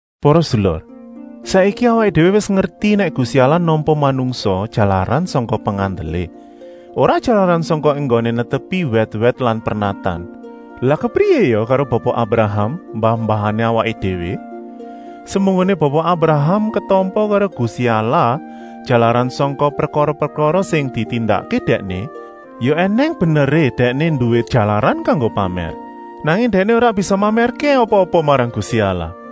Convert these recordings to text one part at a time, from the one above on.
Para sedulur, saiki awaké déwé wis ngerti nèk Gusti Allah nampa manungsa jalaran sangka pengandelé, ora jalaran sangka enggoné netepi wèt-wèt lan pernatan. Lah kepriyé ya karo Bapa Abraham, mbah-mbahané awaké déwé? Semunggoné Bapa Abraham ketampa karo Gusti Allah jalaran sangka prekara-prekara sing ditindakké dèkné, ya ènèng beneré dèkné nduwé jalaran kanggo pamèr. Nanging dèkné ora bisa mamèrké apa-apa marang Gusti Allah.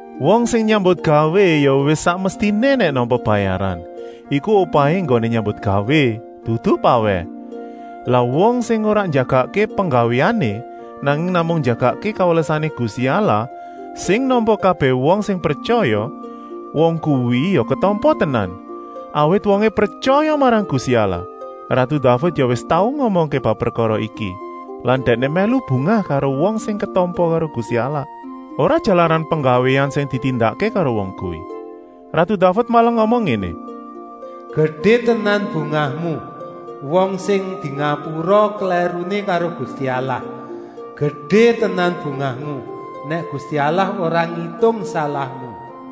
Wong sing nyambutgawé ya wis sak mestiné nèk nampa bayaran, iku upahé enggoné nyambutgawé, dudu pawèh. Lah wong sing ora njagakké penggawéané, nanging namung njagakké kawelasané Gusti Allah sing nampa kabèh wong sing pretyaya, wong kuwi ya ketampa tenan, awit wongé pretyaya marang Gusti Allah. Ratu Daved ya wis tau ngomongké bab prekara iki lan dèkné mèlu bungah karo wong sing ketampa karo Gusti Allah, ora jalaran penggawéan sing ditindakké karo wong kuwi. Ratu Daved malah ngomong ngéné: “Gedé tenan bungahmu, wong sing dingapura klèruné karo Gusti Allah. Gedé tenan bungahmu, nèk Gusti Allah ora ngitung salahmu!”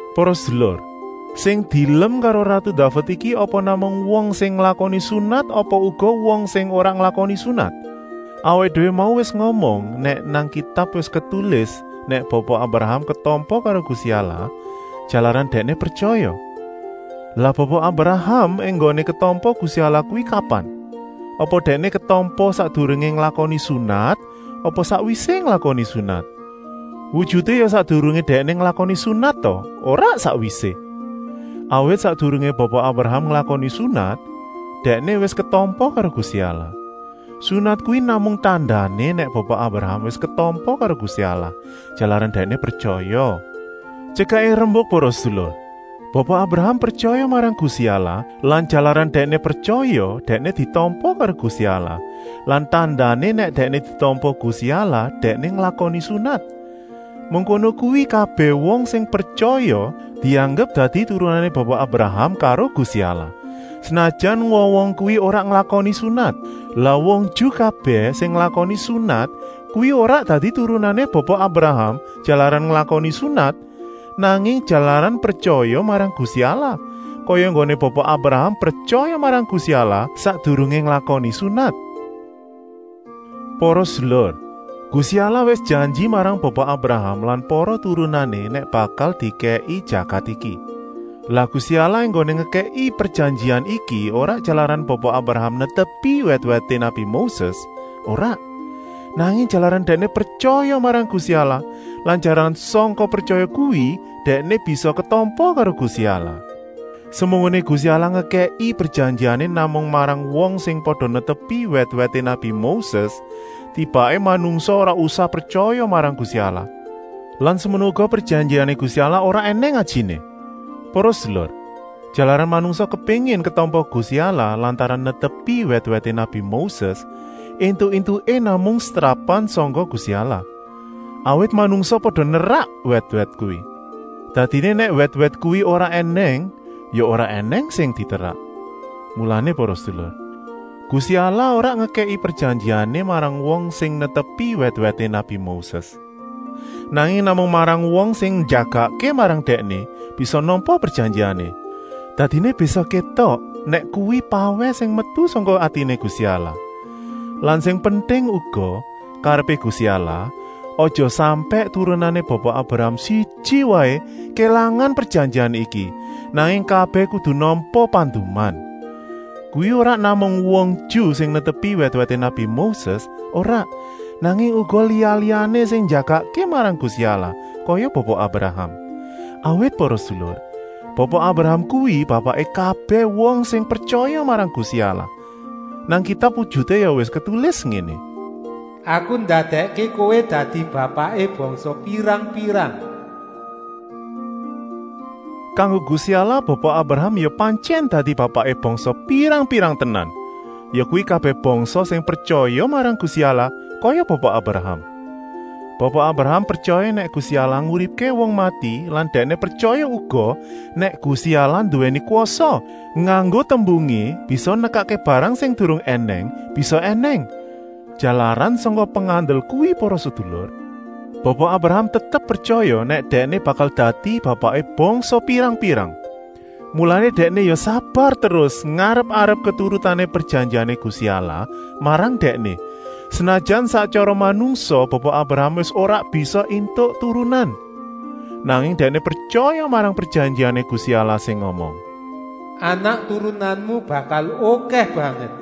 Para sedulur, sing dielem karo ratu Daved iki apa namung wong sing nglakoni sunat apa uga wong sing ora nglakoni sunat? Awaké déwé mau wis ngomong nèk nang Kitab wis ketulis nèk Bapa Abraham ketampa karo Gusti Allah, jalaran dèkné pretyaya. Lah Bapa Abraham enggoné ketampa Gusti Allah kuwi kapan. Apa dèkné ketampa sakdurungé nglakoni sunat apa sakwisé nglakoni sunat? Wujuté ya sakdurungé dèkné nglakoni sunat ta, ora sakwisé. Awit sakdurungé Bapa Abraham nglakoni sunat, dèkné wis ketampa karo Gusti Allah. Sunat kuwi namung tandané nèk Bapa Abraham wis ketampa karo Gusti Allah, jalaran dèkné pretyaya. Tyekaké rembuk para sedulur, Bapa Abraham pretyaya marang Gusti Allah lan jalaran dèkné pretyaya dèkné ditampa karo Gusti Allah lan tandané nèk dèkné ditampa Gusti Allah dèkné nglakoni sunat. Mengkono kuwi kabèh wong sing pretyaya dianggep dadi turunané Bapa Abraham karo Gusti Allah, senajan wong-wong kuwi ora nglakoni sunat. Lah wong Ju kabèh sing nglakoni sunat kuwi ora dadi turunané Bapa Abraham jalaran nglakoni sunat, nanging jalaran pretyaya marang Gusti Allah, kaya enggoné Bapa Abraham pretyaya marang Gusti Allah, sakdurungé nglakoni sunat. Para sedulur, Gusti Allah wis janji marang Bapa Abraham lan para turunané nèk bakal dikèki jagat iki. Lah Gusti Allah enggoné ngekèki prejanjian iki ora jalaran Bapa Abraham netepi wèt-wèté nabi Moses, ora, nanging jalaran dèkné pretyaya marang Gusti Allah lan jalaran sangka pretyaya kuwi dèkné bisa ketampa karo Gusti Allah. Semunggoné Gusti Allah ngekèki prejanjiané namung marang wong sing pada netepi wèt-wèté nabi Moses, tibaké manungsa ora usah pretyaya marang Gusti Allah lan semono uga prejanjiané Gusti Allah ora ènèng ajiné. Para sedulur, jalaran manungsa kepéngin ketampa Gusti Allah lantaran netepi wèt-wèté nabi Moses, éntuk-éntuké namung setrapan sangka Gusti Allah, awit manungsa pada nerak wèt-wèt kuwi. Dadiné nèk wèt-wèt kuwi ora ènèng ya ora ènèng sing diterak. Mulané para sedulur, Gusti Allah ora ngekèki prejanjiané marang wong sing netepi wèt-wèt nabi Moses, nanging namung marang wong sing njagakké marang Dèkné bisa nampa prejanjiané. Dadiné bisa kétok, nèk kuwi pawèh sing metu sangka atiné Gusti Allah. Lan sing penting uga, karepé Gusti Allah, aja sampèk turunané Bapa Abraham siji waé kélangan prejanjian iki, nanging kabèh kudu nampa panduman. Kuwi ora namung wong Ju sing netepi wèt-wèté nabi Moses, ora, nanging uga liya-liyané sing njagakké marang Gusti Allah kaya Bapa Abraham. Awit para sedulur, Bapa Abraham kuwi bapaké kabèh wong sing pretyaya marang Gusti Allah. Nang Kitab wujuté ya wis ketulis ngéné: “Aku ndadèkké kowé dadi bapaké bangsa pirang-pirang!” Kanggo Gusti Allah Bapa Abraham ya pantyèn dadi bapaké bangsa pirang-pirang tenan, yakuwi kabèh bangsa sing pretyaya marang Gusti Allah kaya Bapa Abraham. Bapa Abraham pretyaya nèk Gusti Allah nguripké wong mati lan dèkné pretyaya uga, nèk Gusti Allah nduwèni kwasa, nganggo tembungé bisa nekakké barang sing durung ènèng bisa ènèng. Jalaran sangka pengandel kuwi para sedulur, Bapa Abraham tetep pretyaya nèk dèkné bakal dadi bapaké bangsa pirang-pirang. Mulané dèkné ya sabar terus ngarep-arep keturutané prejanjiané Gusti Allah marang dèkné, senajan sak tyara manungsa Bapa Abraham wis ora bisa éntuk turunan. Nanging dèkné pretyaya marang prejanjiané Gusti Allah sing ngomong: “Anak turunanmu bakal okèh banget.”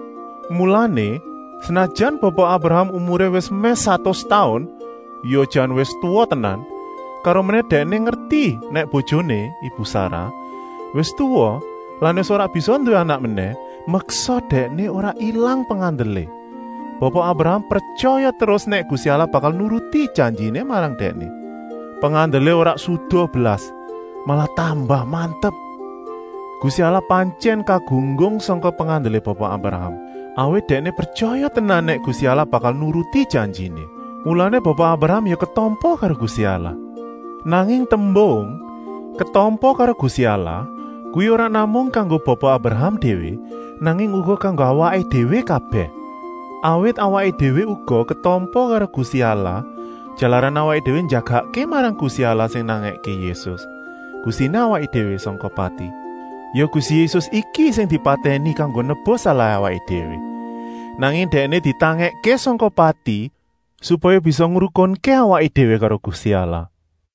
Mulané, senajan Bapa Abraham umuré wis mèh satus taun, ya jan wis tuwa tenan, karomenèh dèkné ngerti nèk bojoné, ibu Sarah, wis tuwa lan wis ora bisa nduwé anak menèh, meksa dèkné ora ilang pengandelé. Bapa Abraham pretyaya terus nèk Gusti Allah bakal nuruti janjiné marang dèkné. Pengandelé ora suda blas, malah tambah mantep. Gusti Allah pantyèn kagunggung sangka pengandelé Bapa Abraham, awit dèkné pretyaya tenan nèk Gusti Allah bakal nuruti janjiné. Mulané Bapa Abraham ya ketampa karo Gusti Allah. Nanging tembung “ketampa karo Gusti Allah” kuwi ora namung kanggo Bapa Abraham déwé, nanging uga kanggo awaké déwé kabèh. Awit awaké déwé uga ketampa karo Gusti Allah, jalaran awaké déwé njagakké marang Gusti Allah sing nangèké Yésus, Gustiné awaké déwé, sangka pati. Ya Gusti Yésus iki sing dipatèni kanggo nebus salahé awaké déwé. Nanging Dèkné ditangèkké sangka pati, supaya bisa ngrukunké awaké déwé karo Gusti Allah.